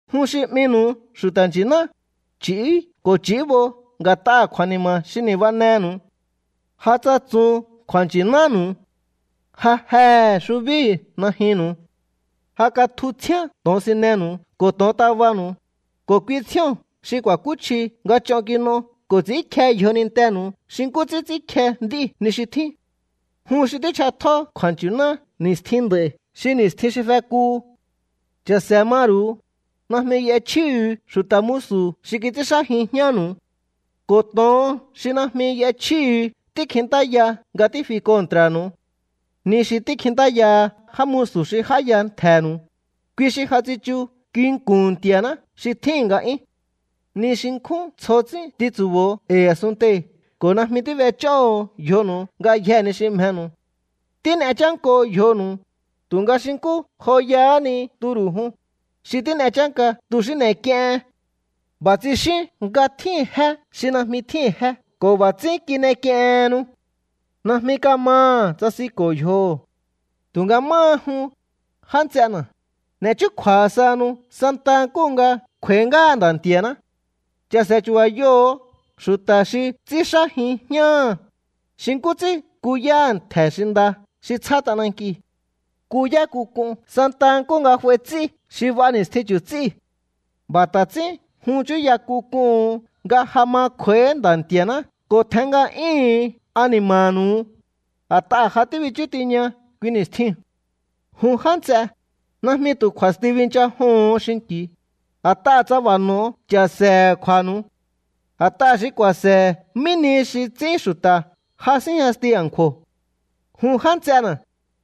Jun xi 'minu̱u xu̱ta̱ nchi̱ná, ch'i̱ú ko̱ ch'i̱íbo nga̱t'aha̱ kju̱a̱ni̱ma̱ xi ni̱banenu̱u. Ja tsatsun kju̱a̱nchi̱nánu̱u. Ja jehe̱ xubíu̱ najyunnu̱u. Ja katju tsjíán to̱onsinenu̱u ko̱ to̱ontabanu̱u, ko̱ kui tsjío̱n xi kju̱a̱kúchji nga ch'on kin'o ko̱ ts'i̱ínkje yjonintenu̱u xi nkú ts'ín ts'ínkje nd'íu̱ ni xi tjín. Jun xi tích'atjó kju̱a̱nchi̱ná ni̱stjin nd'a̱i̱ xi ni̱stjin xi fekuhu. Cha̱se̱ maru̱u. Najmi y'echjíhu̱u xu̱ta̱ musu̱ xi kits'ínxájin jñánu̱u, ko̱ to̱on xi najmi y'echjíhu̱u tíkjintáya nga tífi kontra̱nu̱u. Ni xi tíkjintáyaha já musu̱ xi j'áya ntje̱nu̱u, kui xi ja tsichu nginku̱n Nti̱a̱ná xi tjíhi̱n nga'yún. Ni xi nkjún tsjo ts'ín tintsu̱bo̱o e̱i̱ a̱sunntei̱ ko̱ najmi tíb'ech'óho̱o yjonu̱u ngayjee̱ ni xi mjenu̱u. Tín'e chánko yjonu̱u, tu̱nga xi nkú joyahá ni turu̱ jun, xi tín'e chánka tu̱ xi n'e̱k'iehen. B'a̱ tsixíún nga tjíhi̱n jé xi najmi tjíhi̱n jé ko̱ b'a̱ ts'ín kin'ek'iehennu. Najmi ka̱maha̱ tsasinko̱ yjoho̱. Tu̱nga máha jun, já nts'ena̱, n'e̱ chúkju̱a̱ sahanu santa nkúhu nga kj'u̱a̱í ngáha Nda̱ Nti̱a̱ná. Cha̱se̱ chu̱ba̱yoho̱o xu̱ta̱ xi ts'ínxájin jñáha̱, xi nkú ts'ín kuyáha̱ ntje̱ xi nda xi tsjá t'anankiu̱. Kuyá k'uk'un santa nkúhu nga f'ai ts'í xi b'a ni̱stjin chu̱ts'íu̱. B'a̱ ta̱ ts'ín jun chúya k'un k'uhu̱un nga ja ma kj'u̱a̱íhí Nda̱ Nti̱a̱ná ko̱ tjen nga'yúhu̱un ani̱ma̱nu̱u, a̱t'aha̱ ja tíbichú tiña kui ni̱stjiu̱n. Jun já nts'e, najmi tu̱ kju̱a̱sti binchajoho̱on xinki̱u, a̱t'aha̱ tsa b'a̱ n'o̱o cha̱se̱he̱ kju̱a̱nu̱u. A̱t'aha̱ xi ku̱a̱se̱he̱ mí nihi xi ts'ín xu̱ta̱ ja síjñasti a̱nkju̱o̱. Jun já nts'ena̱,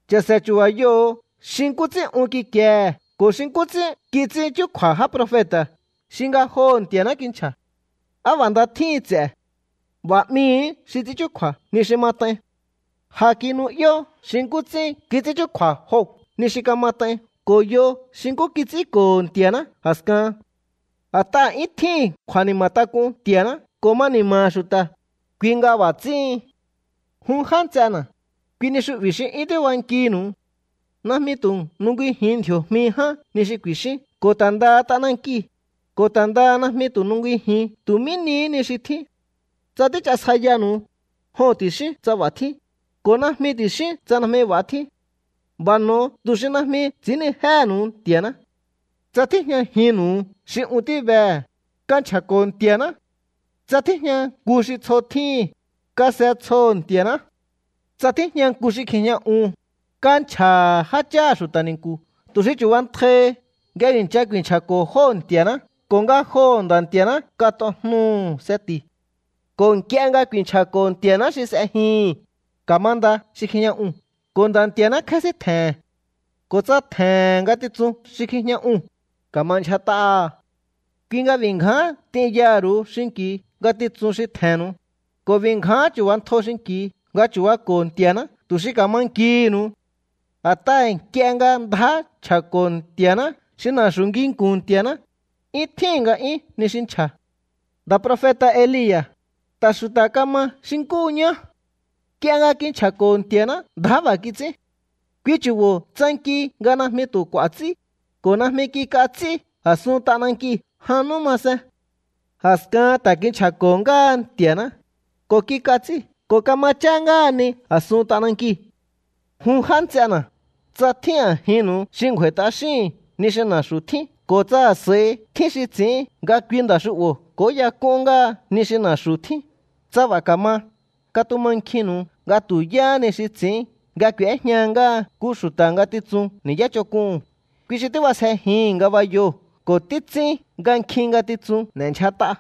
cha̱se̱ chu̱ba̱yoho̱o xi nkú ts'ín un kikiehe̱ ko̱ xi nkú ts'ín kits'ín chúkju̱a̱ já profeta̱ xi ngajoho̱ Nti̱a̱ná kinchja̱. “¡Á b'a̱ nda tjíhin ts'e̱!” B'a̱ 'mihi̱í xi ts'ín chúkju̱a̱ ni xi mat'ain. Ja kinu'yó xi nkú ts'ín kits'ín chúkju̱a̱ Job ni xi kamat'ain ko̱ yo xi nkú kits'ínko̱ho̱ Nti̱a̱ná a̱skahan. A̱t'aha̱ 'yún tjíhi̱n kju̱a̱ni̱ma̱tak'un Nti̱a̱ná ko̱ ma ni̱ma̱ha̱ xu̱ta̱, kui nga b'a̱ ts'íhin. Jun já nts'ena̱, kui ni xu'bi̱ xi 'yún tíbankinu̱u. Najmi tu̱ nungijiun ndji̱o̱jmi ján ni xi ku̱i̱xíún ko̱ ta̱ ndaha t'anankiu̱, ko̱ ta̱ ndaha najmi tu̱ nungijiun tu̱ mí nihí ni xi tjín. Tsa tíchasjaiyanu̱u, “joho̱n” ti̱xíún tsa b'a̱ tjín, ko̱ “najmi” ti̱xíún tsa najmi b'a̱ tjín. B'a̱ n'o̱o tu̱ xi najmi ts'i̱ínnijéhe̱nu̱u Nti̱a̱ná. Tsa tíjñajinnu̱u xi un tíbehe̱, kanchja̱ko̱ Nti̱a̱ná. Tsa tíjña nku xi tsjo tjíhi̱n, kase tsjoho̱ Nti̱a̱ná. Tsa tíjña nku xi kjijña un, kanchja̱ha̱ jácháha̱ xu̱ta̱ ni̱nku̱ tu̱ xi chu̱bantjaihi nga i̱ncha ku̱i̱nchja̱ko̱ jóo̱ Nti̱a̱ná ko̱ ngajoho̱ Nda̱ Nti̱a̱ná kat'ojnuhu̱ seti̱. Ko̱ nk'ie nga kuinchja̱ko̱ Nti̱a̱ná xi s'ejihi̱n, ka̱manda xi kjijña uu̱n ko̱ Nda̱ Nti̱a̱ná kjésíntje̱he̱n. Ko̱ tsa tje̱he̱n ngatitsun xi kjijña uu̱n, ka̱ma ndyjat'aha̱. Kui nga b'i̱ ngján t'inyaha̱ ru̱u xinki̱u ngatitsun xi tje̱nnu̱u, ko̱ b'i̱ ngján chu̱ba̱ntjo xinki̱u nga chu̱bako̱ Nti̱a̱ná tu̱ xi ka̱ma nkihi̱nu̱u. A̱t'aha̱ nk'ie nga ndjá nchja̱ko̱ Nti̱a̱ná xi na̱xu̱ nginku̱n Nti̱a̱ná, 'yún tjíhi̱n nga'yún ni xi nchja̱. Nda̱ profeta̱ Elia̱, ta̱ xu̱ta̱ kama xi nkúhu ñá. Nk'ie nga kinchja̱ko̱ Nti̱a̱ná ndjá b'a̱ kits'ín. Kui chu̱bo̱ tsanki nga najmi tu̱ k'u̱a̱ ts'í, ko̱ najmi kik'a ts'í a̱sun t'anankiu̱ jan nú masen. A̱skahan ta̱ kinchja̱ko̱ ngáha Nti̱a̱ná, ko̱ kik'a ts'í ko̱ kama chá ngáha ni a̱sun t'anankiu̱. Jun já nts'ena̱, tsa tjín a̱jinnu̱u xi ngju̱a̱i̱ t'axíhi̱n ni xi na̱xu̱ tjín ko̱ tsa a̱s'a̱i tjín xi ts'i̱ín nga kui nda̱ xu'bo̱ k'o̱óyak'un ngáha ni xi na̱xu̱ tjíu̱n, tsa b'a̱ ka̱ma, katumankjinnu̱u nga tu̱ yáhá ni xi ts'i̱ín nga k'u̱éjña ngáha nku xu̱ta̱ngatitsun ni̱yá ch'onk'uhu̱n, kui xi tíb'asjejihi̱n ngabayoo̱ ko̱ títs'ín nga nkjin ngatitsun n'e̱ndyjat'a.